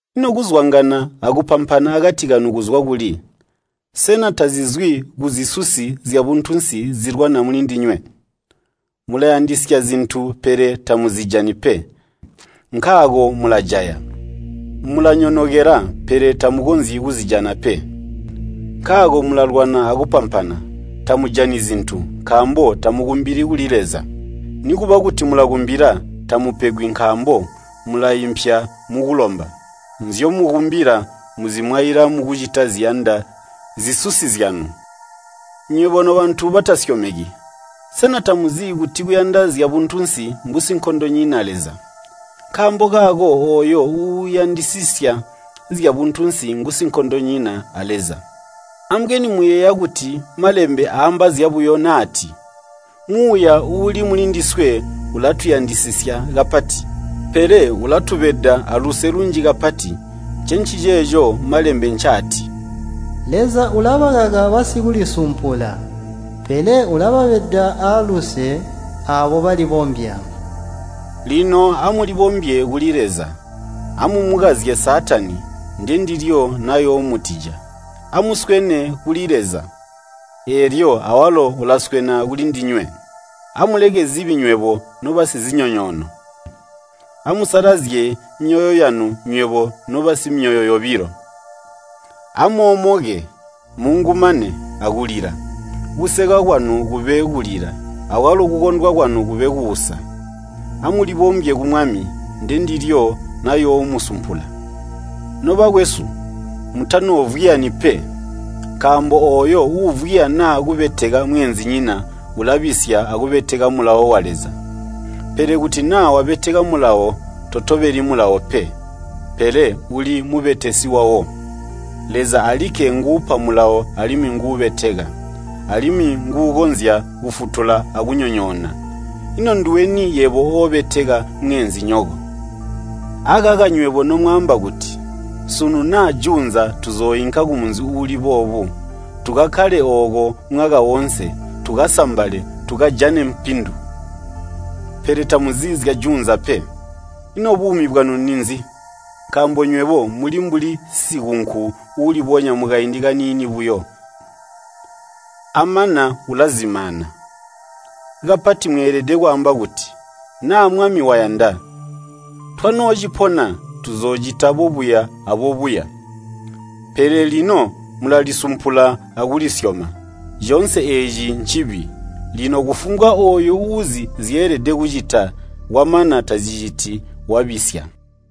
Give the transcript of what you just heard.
Ino kuzwangana akupampana akati kanu kuzwa kuli? Sena tazizwi kuzisuzi zyabuntunsi zilwana mulindinywe? Mulayandisya zintu pele tamuzijani pe, nkaako mulajaya. Mulanyonokela, pele tamukonzyi kuzijana pe, nkaako mulalwana akupampana. Tamujani zintu, nkaambo tamukumbili kuli Leza. Nikuba kuti mulakumbila, tamupegwi nkaambo mulaimpya mukulomba. Nzyomukumbila muzimwaila mukucita ziyanda zisusi zyanu. Nywebo nobantu batasyomeki! Sena tamuzi kuti kuyanda zyabuntunsi mbusinkondonyina Leza? Nkaambo kaako ooyo uuyandisisya zyabuntunsi ngusinkondonyina a Leza. Ambweni muyeeya kuti Malembe aamba zyabuyo naati, “Muuya uuli mulindiswe ulatuyandisisya kapati.” Pele ulatubeda aaluse lunji kapati, ncenciceeco Malembe ncaati, “Leza ulabakaka basikulisumpula, pele ubabeda aaluse aabo balibombya.” Lino amulibombye kuli Leza. Amumukazye Saatani, ndendilyo nayoomutija. Amuswene kuli Leza, eelyo awalo ulaswena kulindinywe. Amuleke zibi nywebo nobasizinyonyoono. Amusalazye myoyo yanu, nywebo nobasimyoyo yobilo. Amoomoke, muungumane, akulila. Kuseka kwanu kube kulila, akwalo kukondwa kwanu kube kuusa. Amulibombye ku Mwami, ndendilyo nayoomusumpula. Nobakwesu, mutanoovwiyani pe. Nkaambo ooyo uuvwiya naa kubeteka mweenzinyina ulabisya akubeteka Mulawo wa Leza. Pele kuti naa wabeteka Mulawo, totobeli Mulawo pe, pele uli mubetesi wawo. Leza alikke nguupa Mulawo alimwi nguubeteka, alimwi nguukonzya kufutula akunyonyoona. Ino nduweni yebo oobeteka mweenzinyoko? Akaka nywebo nomwaamba kuti, “Sunu naa juunza tuzooinka kumunzi uuli boobu, tukakkale ooko mwaka woonse, tukasambale, tukajane mpindu.” Pele tamuzi zyajuunza pe. Ino buumi bwanu ninzi? Nkaambo nywebo muli mbuli sikunku uulibonya mukaindi kaniini buyo, amana ulazimaana. Kapati mweelede kwaamba kuti, “Naa Mwami wayanda, twanoocipona, tuzoocita boobuya aboobuya.” Pele lino mulalisumpula akulisyoma. Coonse eeci ncibi. Lino kufumbwa ooyo uuzi nzyeelede kucita, kwamana taziciti, wabisya.